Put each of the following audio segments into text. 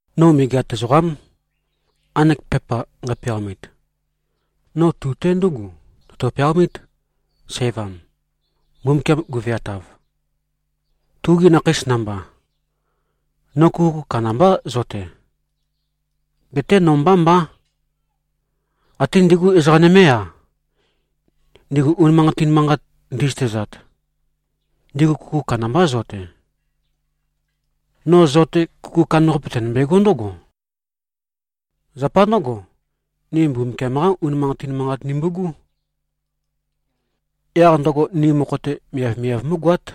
No megeat ezoqám, nqanek pepa nqæpeaomit. No tu-te ndúgu tøtø-peaomít, sævam, Mbumbukiam guveatav, tugi nakheis namba. No kuku kandambá, zo-te. Geté no mbá mbá. Até ndigu ezoqa nømé-a, ndigu unimanqatin manqat ndi꞉zøtezat, ndigu kuku kandambá, zo-te. No zo-te, kuku kandambaqape, tønømbegó ndǿgo: Zapa ndǿgo, ni Mbumbukiam-qá unimanqatin manqat nimbu꞉gú. Yaq ndøgo ni mokho-te miavmiav mú꞉goát.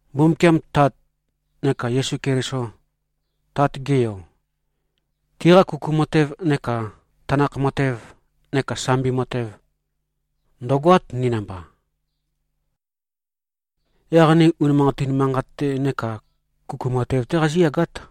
Mbumbukiam, Tat, neka Yesu Keliso, Tat-ge Yo, tiqa kuku matev neka tanakh matev neka sambi matev, ndø̀goát, ni namba. Yaq ni unimanqatin manqat-te neka kuku matev-té qazíyagát.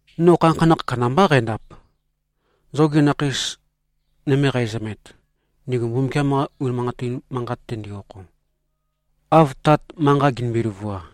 No khanakhanakh kandambá qændap, zogi nakheis nøme qæzømet, ndigu Mbumbukiam-qa unimanqatin manqat-te ndi-okho, av Tat manqa ginimbi-løvua.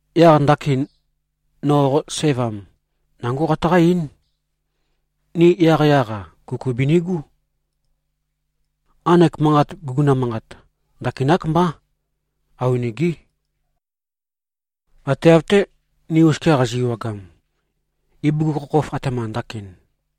Yaq ndakin, no qo sævam, nangó qataqá-eín: Ni yaqyaq-a, kuku binigú. Nqanek manqat, guguna manqat ndakinák mbá. Awenegé. Ate av-té, ni oskia qazi꞉-ewagam, ibugukhokhof, atema ndakin.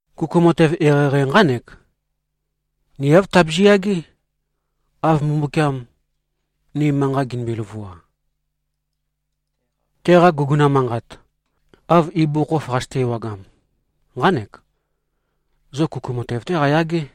Kuku matev eqeieqei nqánek: Ni āv tabizi꞉-yagé, av Mbumbukiam, ni manqa ginimbi-løvua. Teqa guguna manqat, av ibugukhokhof qazøte-ewagam, nqánek: Zo kuku matev-té qayagé.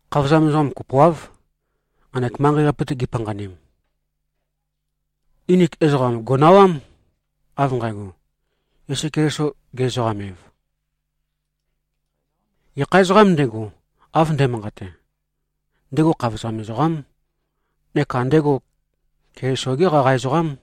Khavozam nømendim ezoqam kopoáv, nqanek manqei-qape-te gipanqanim. Nginik ezoqam gò꞉nawám, av nqægo, Yesu Keliso ge-ezoqam-ev. Gekha ezoqām ndego, av nde꞉manqate, ndego khavozam ezoqám neka ndego Keliso-gé qaqa ezoqám.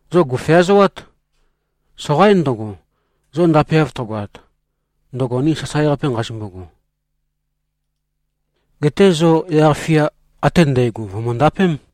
Zo gò꞉feazoát. Soqaín ndøgo, zo ndapeav tøgoat, ndøgo ni sasae-qape nqazimbogo. Geté zo yaq-fia ate ndægo, vø̀møndapém.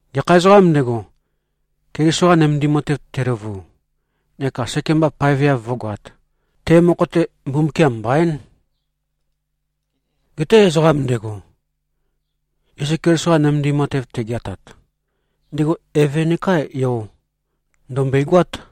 Gekha ezoqām ndego, Keliso-qa nømendim matev teløvu neka sekemba paeveav vǿgoāt, te mokho-te Mbumbukiam mbaín. Geté ezoqam ndego, Yesu Keliso-qa nømendim matev tegeatat, ndego Eve nekā Yo, ndø̀mbøigoát.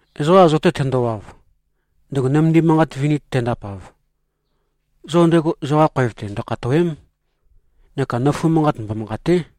Ezoqa zo-te tendowav, ndego nømendim matev vini tendapav, zo ndego zoqa khoev-te ndøkhatòwe᷄m, neka nøfu manqat mbomanqàte᷄.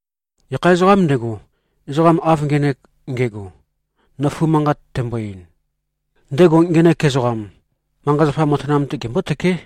Gekha ezoqām ndego, ezoqam av ngenek nge꞉go, nøfu manqat tembo-ein, ndego ngenek ezoqam, manqa-zapa matanam-te gembótøké.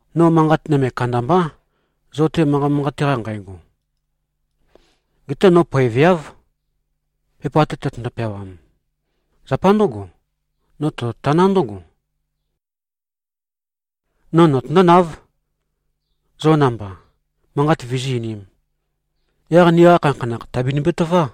No manqat nøme kandambá, zo-te manqa manqate-qa nqægo. Geté no poeveáv, pepa-te tøtøndo-peawam. Zapa ndǿgo, no tototaná ndǿgo: No notøndónáv, zo namba manqat vizí-einīm. Yaq niqa khanakhanakh, tàbinimbi-tøvá.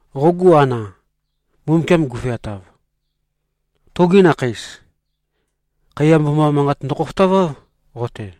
Qogu ana, Mbumbukiam guveatav, tugi nakheis, khaiya mboma manqat ndøkhofotaváv, qo-te.